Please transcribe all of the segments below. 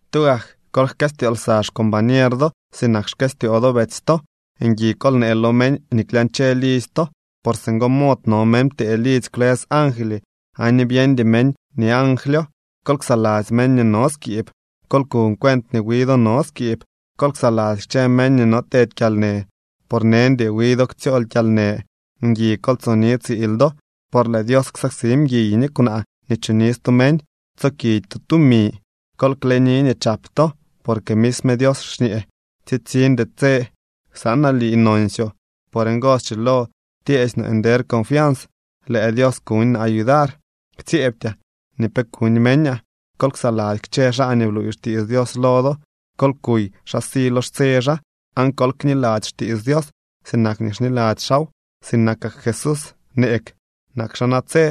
Tugak kol jkëstyoo lsa xcombañer do sinak xkëstyoo do betsy to. Ngui kol nee lo meñ nii klyañche lidzy to, por singo mod no meñ ptee lidzy kwlës angly aan ni byeñdy meñ nii anglyo. Kol ksaladzy meñ nii no skiib. Kol kuñ cuent nii wi do no skiib. Kol ksaladzy kchë meñ nii no tedy kyalnë, por neñdy wi do ktsyool kyalnë. Ngui kol tsoni tsiil do, por lëë Dios ksaksi mguiy ni kwnaa nii choni stu meñ. Tsokidy to tumi. Kol kleni nii chap to, porque misme Dios xñee: “Tsitsiñdy tse ksanaa lii nonsyoo.” Por ngo schilo tyeesy no nder confians: Lëë Dios kuñ naa yudar, ktsyeebtyaa nii pe kuñ meñaa. Kol ksaladzy kchë xaa nii bluuy xtiits Dios lo do. Kol kuy xa si lo xtse xaa, aan kol kniladzy xtiits Dios sinak nii xniladzy xaaw. Sinakak Jesús neeg, nak xaa natse.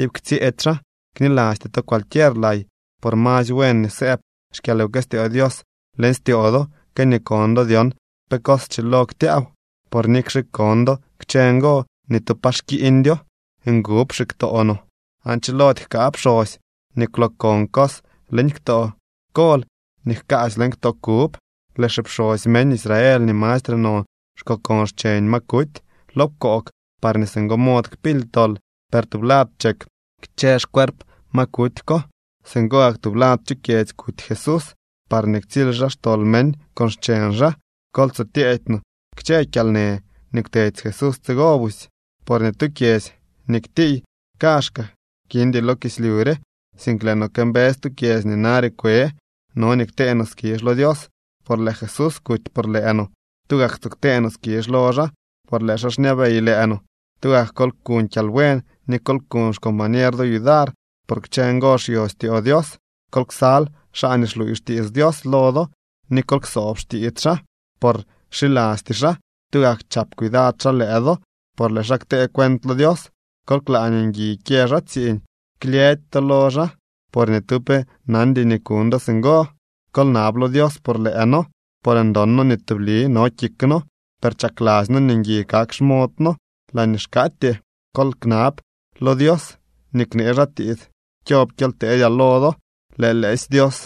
Iip ktsyëëdy xaa. Knilasty to cualquier lay. Por masy buen nii sëëb xkyalwkëstyoo Dios leñ styoo do que nii kon do dyon pe cos schilo ktyaaw. Por nikxe kon do kchë ngo, ni tu pa xkiiñdyo. Ngub xiktoo no, aan chilody jkaa pxosy nii kwlookon cos leñ ktoo kol nii jkaasy leñ ktoo kub. Lëë xipxosy meñ Israel nii mastre non xkokon xcheñ ma kuty lo pkoog parñee singo mod kpily tol, per tublad chek kchë xcuerp ma kuty ko. Singo gak tublad chu kyedzy kuty Jesús parñee ktsily xaa xtol meñ con xcheñ xaa. Kol tso tyeedy no kchë kyalnë nii kwtedy Jesús tsigo busy. Por ni tu kyedzy nii ktiiy kaazhkaa kindy lo kislyu re, sink lëë no këmbëës tu kyedzy nii nare kwe. No nii ktee no skizh lo Dios, por lëë Jesús kuty por lëë no. ¡Tugak tso ktee no skizh lo xaa!, por lëë xaa xñabey lëë no. Tugak kol kuñ kyalbuen ni kol kuñ xcombañer do yudar, por kchë ngo xyo styoo Dios. Kol ksal xaa nii xluuy xtiits Dios lo do ni kol ksoob xtiits xaa, por xilasty xaa, tugak chap cuidad xaa lëë do, por lëë xaa ktee cuent lo Dios. Kol klaa nii ngui kyë xaa tsiiñ. Klyëdy to lo xaa, por ni tu pe nandy nii kuñ do singo. Kol nab lo Dios por lëë noo, por ndon noo nii tubli no kik noo, per chakladzy noo nii ngui kak xmood noo laañee xkaatyee. Kol knab lo Dios nii knee xaa tiits kyob kyely teedyaa lo do. Lëë lëësy Dios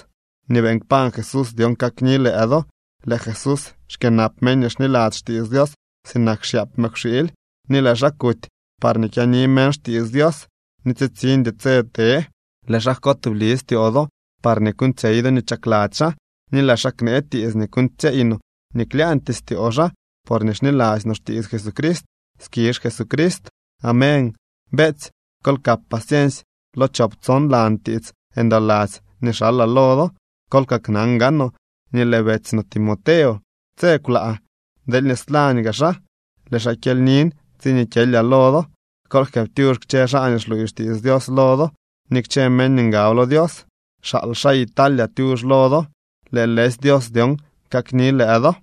nii beeñ kpañ Jesús dyon kakni lëë do. Lëë Jesús xkyënap meñ nii xniladzy xtiits Dios sinak xyaap mëkwxiily, ni lëë xaa kuty parñee kyaani meñ xtiits Dios nii tsitsiñdy tse te. Lëë xaa jko tubli styoo do parñee kuuñtsyey do nii chakladzy xaa, ni lëë xaa knee tiits nii kuuñtsyeey no nii klyaañtyee styoo xaa porñee xniladzy no xtiits Jesucrist. ¡Skizh Jesucrist! Amén. Beetsy, kol kap paciensy lo chop tson lan tiits ndoladzy nii xalaa lo do. Kol kaknan gaanoo nii lëë betsy no Timoteo tse kwlaa. Deelñee slañ gaa xaa, lëë xaa kyelynin tsiñee kyelyaa lo do. Kol jkëëptyux kchë xaa nii xluuy xtiits Dios lo do ni kchë meñ nii ngab lo Dios. Xaal xaa Italia tyux lo do. Lëë lëësy Dios dyon kakni lëë do.